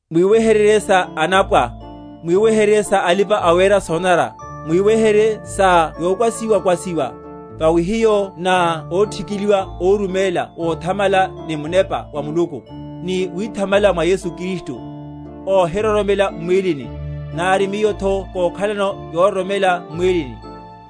Mwiweheryerye sa anapwa, mwiweheryerye sa alipa‐awera sonanara, mwiweheryerye sa yokwasiwa‐kwasiwa; vawi hiyo na óthikiliwa, óruméla vothamala ni Munepa wa Muluku, ni withamala mwa Yesu Kristu, óhiroromela m’mwílini; nari miyotho kókhalano yororomela m’mwílini;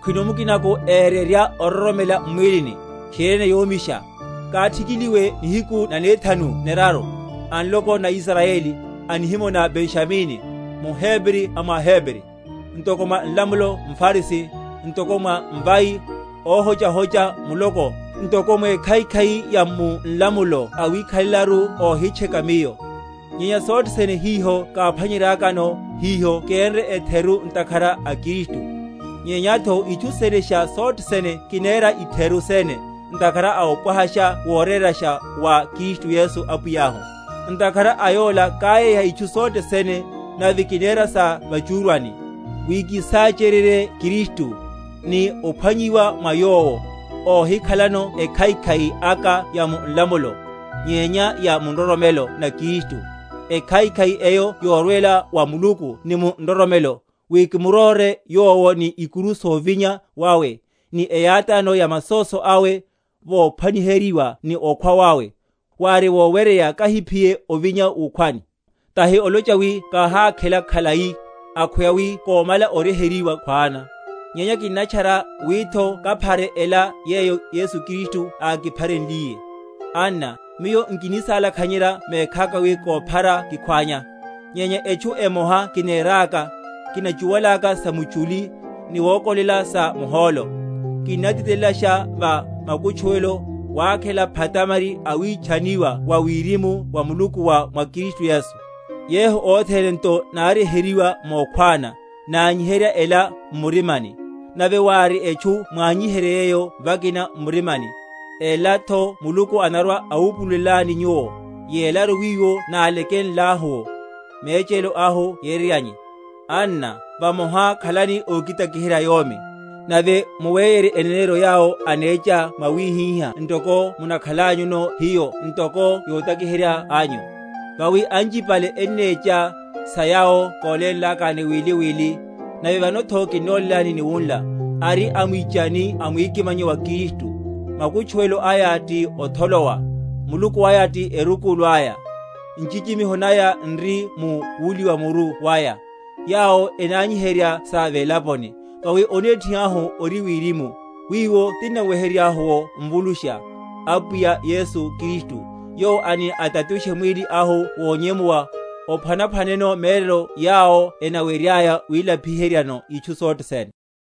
khwino mukinako ererya ororomela m’mwílini, tchiriene yomisha; káthikiliwe nihiku nanethanu neraru, a nloko na Israyeli, a nihimo na Benjamini, muHebri a mwa aHebri; ntoko mwa nlamulo mFarisi; ntoko mwa mvai, óhochahocha muloko; ntoko mwekhaikhai ya mu nlamulo awikhalelaru óhitcheka miyo. Nyenya sothe sene hiho káphwanyeryakano, hiho kenre etheru ntakhara a Kristu. Nyenyatho itchu senesha sothe sene kinera itheru sene, ntakhara a opwahasha worórasha wa Kristu Yesu Apwiyahu; ntakhara a yola káyéha itchu sothe sene, nave kinera sa va’chúrwani, wi kísáchéryerye Kristu, ni ophwanyiwa mwa Yowo, óhikhalano ekhaikhai aka ya mu nlamulo, nyenya ya mu nroromelo na Kristu, ekhaikhai eyo yorwela wa Muluku ni mu nroromelo; wi kimuróre Yowo, ni ikuru sovinya wawe, ni eyátáno ya masóso awe, vophwaniheryiwa ni okhwa wawe; wári woweryeya kahiphiye ovinya wukhwani. Tahi olocha wi káhákhela khalai, akhweya wi kómala oryeheryiwa khwana; nyenya kinnatchara, witho kaphare ela yeyo Yesu Kristu ákipharenliye. Anna, miyo nkinisalakhenyerya mekhaka wi kóphara kikhwánya; nyenya etchu emoha kineraka; kinachiwalaka samuchuli, ni wokolela sa muhólo, Kinnatitelelasha va makutchuwelo, wakhela phatamari a witchaniwa wa wirimu wa Muluku wa mwa Kristu Yesu. Yehu othene nto náryeheryiwa mokhwána, nanyiherya ela m’murimani; nave wári etchu mwanyiherye yeyo vakina m’murimani, elatho Muluku anarwa‐awupululelani nyuwo; yelaru, wiwo nálakenlahu’wo, mechelo ahu yereryane. Anna, vamoha khalani ókitakiherya yomi, nave muweyerye eneneryo yawo anecha mwawihihá ntoko mukhanlanyuno hiyo ntoko yotakiherya anyu. Vawi anchipale ennecha, sa yawo kólénlakani wili wili, nave vanotho kinnolélani ni wunla, ari amwichani a mwikimanyo wa Kristu; makutchuwelo aya ti otholowa, muluku aya ti erukulu aya, nchichimiho naya n’ri mu wuliwa muru waya, yawo enanyiherya sa velaponi. Vawi onethi ahu ori wirimu; wiwo tinnaweheryeryahu’wo Mvulusha, Apwiya Yesu Kristu; yowo ani atatushe mwíli ahu wonyemuwa, ophwanaphwaneno mérelo yawo enaweryaya wilapi?-?heryano itchu sothe sene.